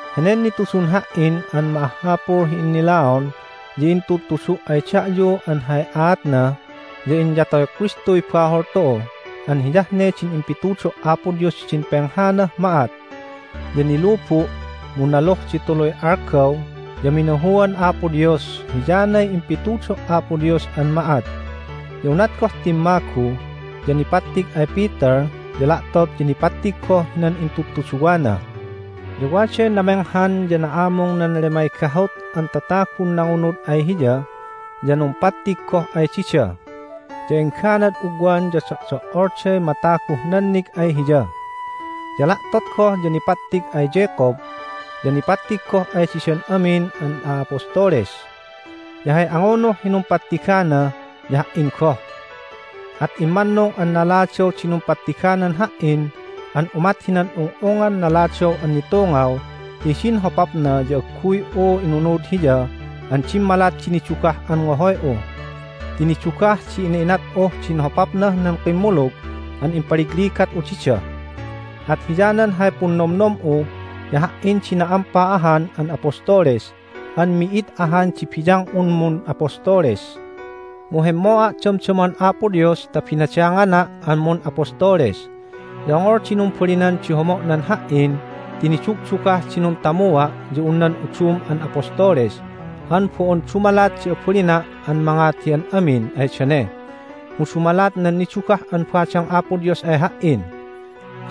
Henen nitudun ha"in an ma'ahhapul hi innilaon ya intudtudu' ay da'yu an hay aatna ya: Inyatoy Kristuy bahol tu'u an hiyah ne din impitudo' Apo Dios hidin penghanah ma'at, ya nilubu', mu naluh di tuluy algaw ya minahuan Apo Dios (hiyanay impitudo' Apo Dios an ma'at). Ya unat goh timmagu ya nipattig ay Peter, ya la'tot ya nipattig goh hinan intudtuduwana. Ya waday namenghan ya na'amung nan lemay gahut an tatagun nangunud ay Hiya, ya numpattig goh ay dida. Ya engganad ugwan ya do'do"olday mataguh nannig ay Hiya. Ya la'tot goh ya nipattig ay Jacob, ya nipattig goh ay didan amin an a'apostoles. Ya hay angunuh hi numpattigana ya ha"in goh. At immannung an naladaw di numpattiganan ha"in an umat hinan ung'ungngan naladaw an nitungaw ti hidin hopapna ya agguy'u inunud Hiya an dimmalat di nidugah an ngohoy'u. Ti nidugah di ina'inat'uh din hopapnah nan kimmulug an impaligligat'u dida. At hiyanan hay punnomnom'u ya ha"in di na'ampa ahan an apostoles an mi'id ahan di biyang'un mun'apostoles. Mu hemmo'a' damdaman Apo Dios ta binadangana' an mun'apostoles. Ya ongol di numbalinan di homo'nan ha"in ti nidugdugah di nuntamua' ya un nan udum an apostoles an bo'on dumalat di abalina' an mangat hi an amin ay dane mu dumalat nan nidugah an badang Apo Dios ay ha"in.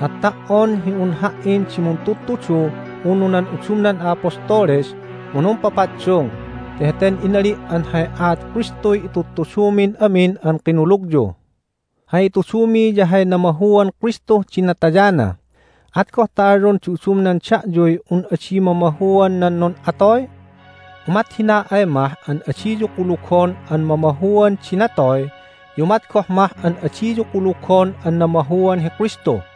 At ta"on hi un ha"in di muntudtudu unu nan udumnan a'apostoles mu numpapaddung ti heten inali' an hay aat Kristuy itudtudumin amin an kinulugyu. Hay itudumi ya hay namahuan Kristuh din natayana. At goh ta alyon di udumnan da'yuy un adi mamahuan nan nun'atoy? Umat hina ay mah an adiyu kulugon an mamahuan di natoy ya umat goh mah an adiyu kulugon an namahuan hi Kristu!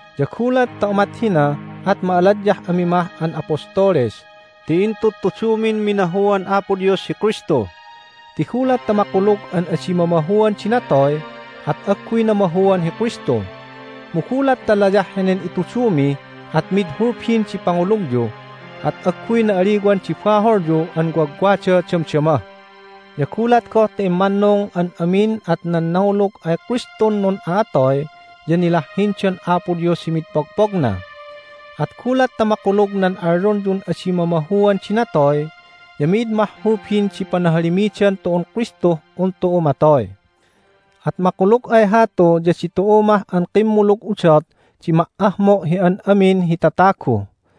Ya gulat ta umat hina at ma'aladyah ami mah an apostoles ti intudtudumin minahuan Apo Dios hi Kristu. Ti gulat ta makulug an adi mamahuan di natoy at agguy namahuan hi Kristu. Mu gulat ta layah henen itudumi at mid hulbin di pangulugyu, at agguy na'aliwan di baholyu an wagwada damdama! Ya gulat goh ta immannung an amin at nan nangulug ay Kristun nun'a'atoy ya nilahhindan Apo Dios hi mid pogpogna! At gulat ta makulug nan alyonyun adi mamahuan di natoy ya mi'id mah hulbin di panahalimidan tu'un Kristuh un tu'u matoy. At makulug ay hatu ya ditu'u mah an kimmulug udot di ma"ahmo' hi an amin hi tatagu.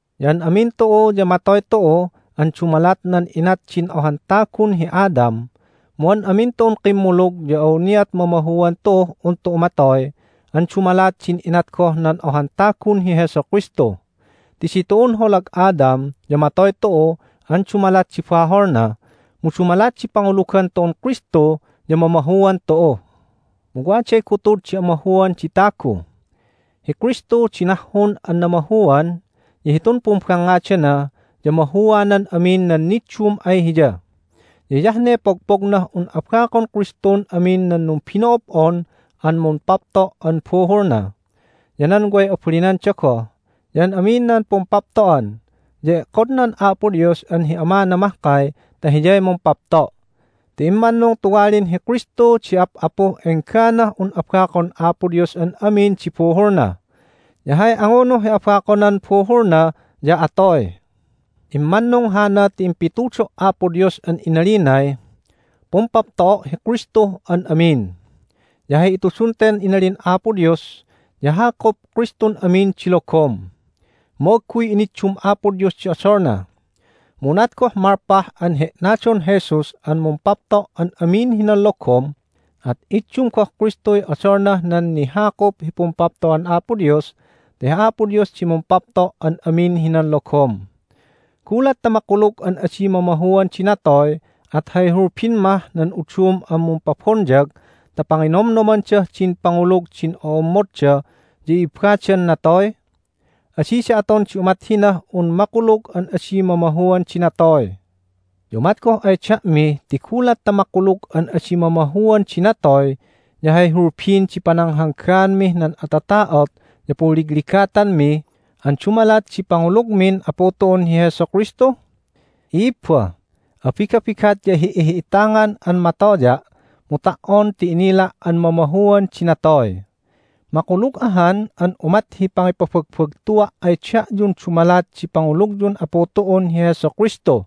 Ya an amin tu'u ya matoy tu'u an dumalat nan inat din ohan tagun hi Adam, mu an amin tu'un kimmulug ya awniat mamahuan tu'uh un tu'u matoy an dumalat din inat goh nan ohan tagun hi Jesu Kristu. Ti ditu'un holag Adam ya matoy tu'u an dumalat di baholna, mu dumalat di pangulugan tu'un Kristu ya mamahuan tu'u. Mu waday gutud di amahuan di tagu. Hi Kristu di nahhun an namahuan, ya hitun pumbangngadana ya mahuanan amin nan niddum ay Hiya. Ya hiyah ne pogpognah un abakon Kristun amin nan numbino'ob'on an mumpapto' an buhulna, ya nan way abalinanda goh, ya an amin nan pumpapto'an, ya e'kodnan Apo Dios an hi Amana mahkay ta Hiyay mumpapto'. Ti immannung tuwalin hi Kristu di Ap'apuh engganah un abakon Apo Dios an amin di buhulna. Ya hay angunuh hi abakonan buhulna ya atoy. Immannung hana ti impitudo' Apo Dios an inalinay, "Pumpapto'o' hi Kristuh an amin." Ya hay itudun ten inalin Apo Dios ya hakup Kristun amin di logom. Mu agguy iniddum Apo Dios di odolna. Mu unat goh malpah an he'nadon Jesus an mumpapto' an amin hinan logom at iddum goh Kristuy odolnah nan nihakup hi pumpapto'an Apo Dios ta hi Apo Dios di mumpapto' an amin hinan logom. Gulat ta makulug an adi mamahuan di natoy at hay hulbin mah nan udum an mumpabonyag ta panginomnomandah din pangulug din o'ommodda ya i'ibbadan natoy? Adida aton di umat hinah un makulug an adi mamahuan di natoy! Ya umat goh ay da'mi ti gulat ta makulug an adi mamahuan di natoy ya hay hulbin di pananghanggaanmih nan atata'ot ya punligligatanmi an dumalat di pangulugmin Apu tu'un hi Jesu Kristu? I'ibba, abigabigat ya hi'ihi'itangan an matoya', mu ta"on ti inila' an mamahuan di natoy. Makulug ahan an umat hi pangipabagbagtua' ay da'yun dumalat di pangulugyun Apu tu'un hi Jesu Kristu.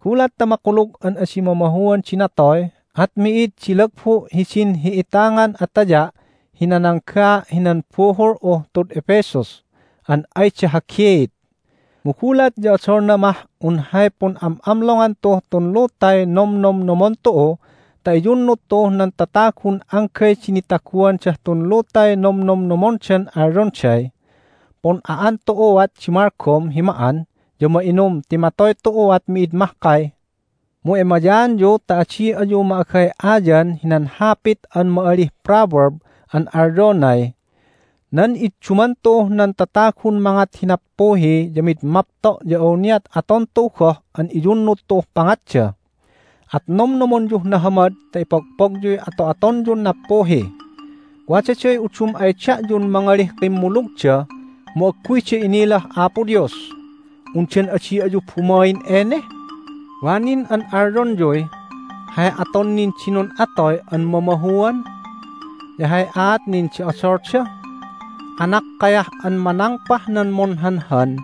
Gulat ta makulug an adi mamahuan di natoy at mi'id di lagbu' hidin hi'itangan ataya' hi nananggaa' hinan buhul'uh tud Ephesus an ayda hagiit. Mu gulat ya odolna mah un hay pun'am'amlongan tu'uh tun lutay nomnomnomon tu'u ta iyunnud tu'uh nan tatagun anggay di nitaguandah tun lutay nomnomnomondan alyonday, "Pun'a'an tu'uat di malgom hi ma'an ya ma'inum ti matoy tu'uat mi'id mahkay." Mu emayaanyu ta adi ayu ma'agay'ayan hinan hapit an ma'alih proverb an alyonay, "Nan idduman tu'uh nan tatagun mangat hi nappuhi ya mid mapto' ya awniat aton tu'u goh an iyunnud tu'uh pangatda." At nomnomonyuh nahamad ta ipogpogyuy ato'atonyun nappuhi. Wadaday udum ay da'yun mangalih kimmulugda mu agguyda inilah Apo Dios. Undan adi ayu bumain ene? Wa nin an alyonyuy, "Hay aton nin di nun'atoy an mamahuan? Ya hay aat nin di odolda?" Anakkayah an manangpah nan munhanhan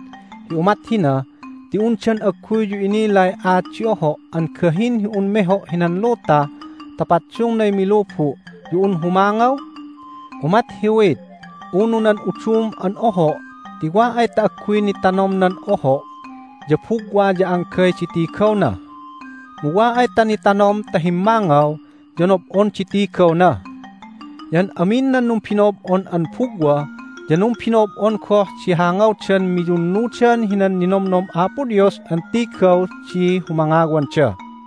hi umat hina ti undan agguyyu inilay aat di oho' an gahin hi un meho' hinan luta ta paddungnay milubu' ya un humangaw? Umat hi wheat unu nan udum an oho' ti wa ay ta agguy nitanom nan oho' ya bugwa ya anggay di tigawna. Mu wa ay ta nitanom ta himmangaw ya nob'on di tigawna. Ya an amin nan numbino'ob'on an bugwa ya numbino'ob'on goh di hangawdan miyunnudan hinan ninomnom Apo Dios an tigaw di humangawanda.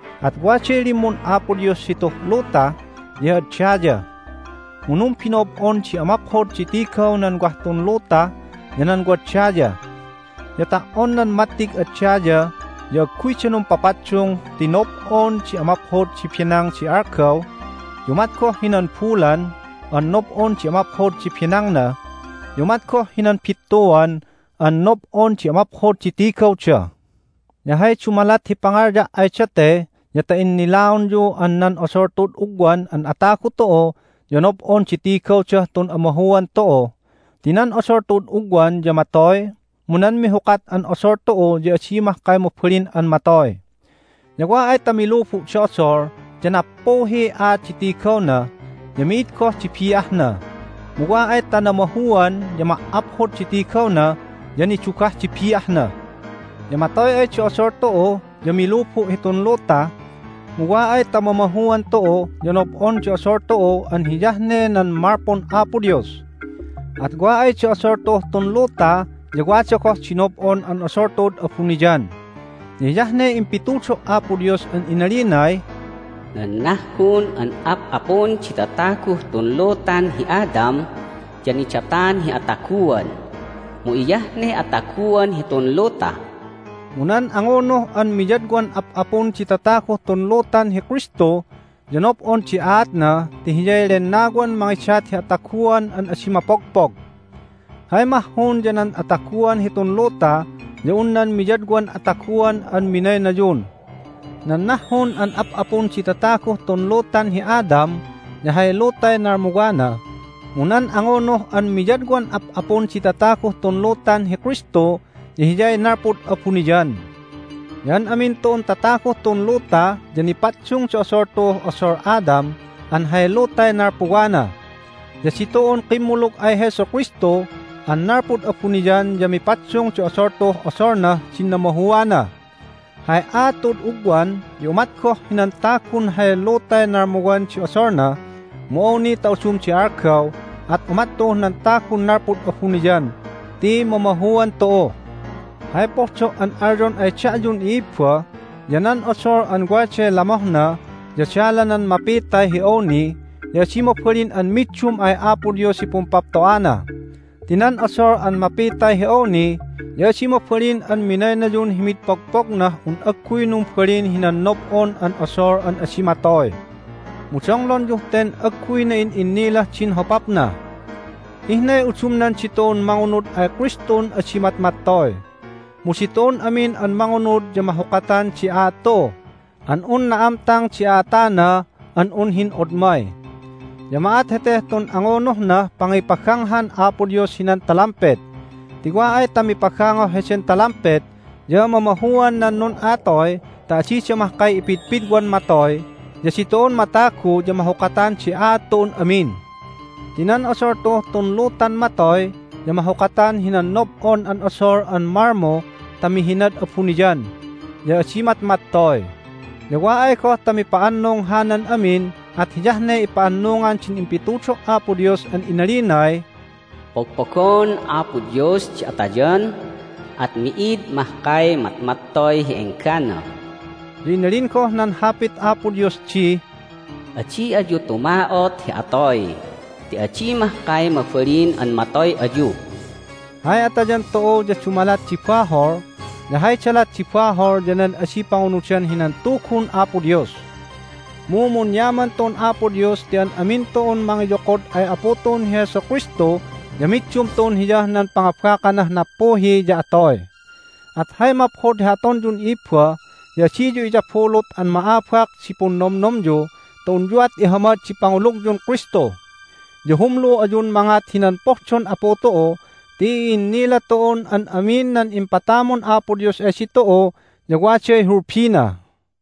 At waday limmun Apo Dios hituh luta ya hi ad daya. Mu numbino'ob'on di amaphod di tigaw nan wah tun luta ya nan wad daya. Ya ta"on nan mattig ad daya ya agguyda numpapaddung ti nob'on di amaphod di benang di algaw, ya umat goh hinan bulan an nob'on di amaphod di benangna, ya umat goh hinan bittuan an nob'on di amaphod di tigawda. Ya hay dumalat hi pangalya' ay date ya ta innilaonyu an nan odol tu'ud ugwan an atagu tu'u ya nob'on di tigawdah tun amahuan tu'u, ti nan odol tu'ud ugwan ya matoy, mu nan mihukat an odol tu'u ya adi mahkay mabalin an matoy. Ya wa ay ta milubu' di odol ya nappuhiy aat di tigawna, ya mi'id goh di bi'ahna. Mu wa ay ta namahuan ya ma"aphod di tigawna, ya nidugah di bi'ahna. Ya matoy ay di odol tu'u ya milubu' hitun luta, mu wa ay ta mamahuan tu'u ya nob'on di odol tu'u an hiyah ne nan malpun Apo Dios. At wa ay di odol tu'uh tun luta ya wada goh di nob'on an odol tu'ud abuniyan. Ya hiyah ne impitudo' Apo Dios an inalinay, "Nan nahhun an ap'apun di tataguh tun lutan hi Adam ya nidatan hi ataguan, mu hiyah ne ataguan hitun luta." Mu nan angunuh an miyadwan ap'apun di tataguh tun lutan hi Kristu ya nob'on di aatna ti Hiyay Lennawan mangidat hi ataguan an adi mapogpog. Hay mahhun ya nan ataguan hitun luta ya un nan miyadwan ataguan an minaynayun. Nan nahhun an ap'apun di tataguh tun lutan hi Adam ya hay lutay nalmuwana, mu nan angunuh an miyadwan ap'apun di tataguh tun lutan hi Kristu ya Hiyay nalpud abuniyan. Ya an amin tu'un tataguh tun luta ya nipaddung di odol tu'uh odol Adam an hay lutay nalpuwana. Ya ditu'un kimmulug ay Jesu Kristu an nalpud abuniyan ya mipaddung di odol tu'uh odolnah din namahuana. Hay aat tu'ud ugwan ya umat goh hinan tagun hay lutay nalmuwan di odolna, mu awni ta udum di algaw at umat tu'uh nan Tagun nalpud abuniyan ti mamahuan tu'u. Hay pohdo' an alyon ay da'yun i'ibba ya nan odol an waday lamohna ya dalanan mapitay hi awni ya adi mabalin an middum ay Apo Dios hi pumpapto'ana. Ti nan odol an mapitay hi awni ya adi mabalin an minaynayun hi mid pogpognah un agguy numbalin hinan nob'on an odol an adi matoy. Mu donglonyuh ten agguy na'in'innilah din hopapna: Ihnay udumnan ditu'un mangunud ay Kristun adi matmattoy. Mu ditu'un amin an mangunud ya mahukatan di aat tu'u an un na'amtang di a'atana an un hin'odmay. Ya ma'at heteh tun angunuhnah pangipaganghan Apo Dios hinan talampet. Ti wa ay ta mipagangoh heden talampet ya mamahuan nan nun'a'atoy ta adida mahkay ipidpidwan matoy, ya ditu'un matagu ya mahukatan di aat tu'un amin. Ti nan odol tu'uh tun lutan matoy ya mahukatan hinan nob'on an odol an malmu ta mihinad abuniyan, ya adi matmattoy. Ya wa ay goh ta mipa'annung hanan amin at hiyah ne ipa'annungan din impitudo' Apo Dios an inalinay, "Pogpogon Apo Dios di atayan, at mi'id mahkay matmattoy hi enggana." Ya inalin goh nan Hapit Apo Dios di, "Adi ayu tuma'ot hi atoy ti adi mahkay mabalin an matoy ayu." Hay atayan tu'u ya dumalat di bahol, ya hay dalat di bahol ya nan adi pangunudan hinan Tugun Apo Dios. Mu munyaman tu'un Apo Dios ti an amin tu'un mangiyokod ay Apu tu'un hi Jesu Kristu ya middum tu'un Hiyah nan pangabakanah nappuhi ya atoy! At hay maphod hi atonyun i'ibba ya adiyu iyabulut an ma'abak di punnomnomyu ta unyuat ihamad di pangulugyun Kristu. Ya humlu ayun mangat hinan pohdon Apu tu'u ti i'innila tu'un an amin nan impatamun Apo Dios ay ditu'u ya waday hulbina.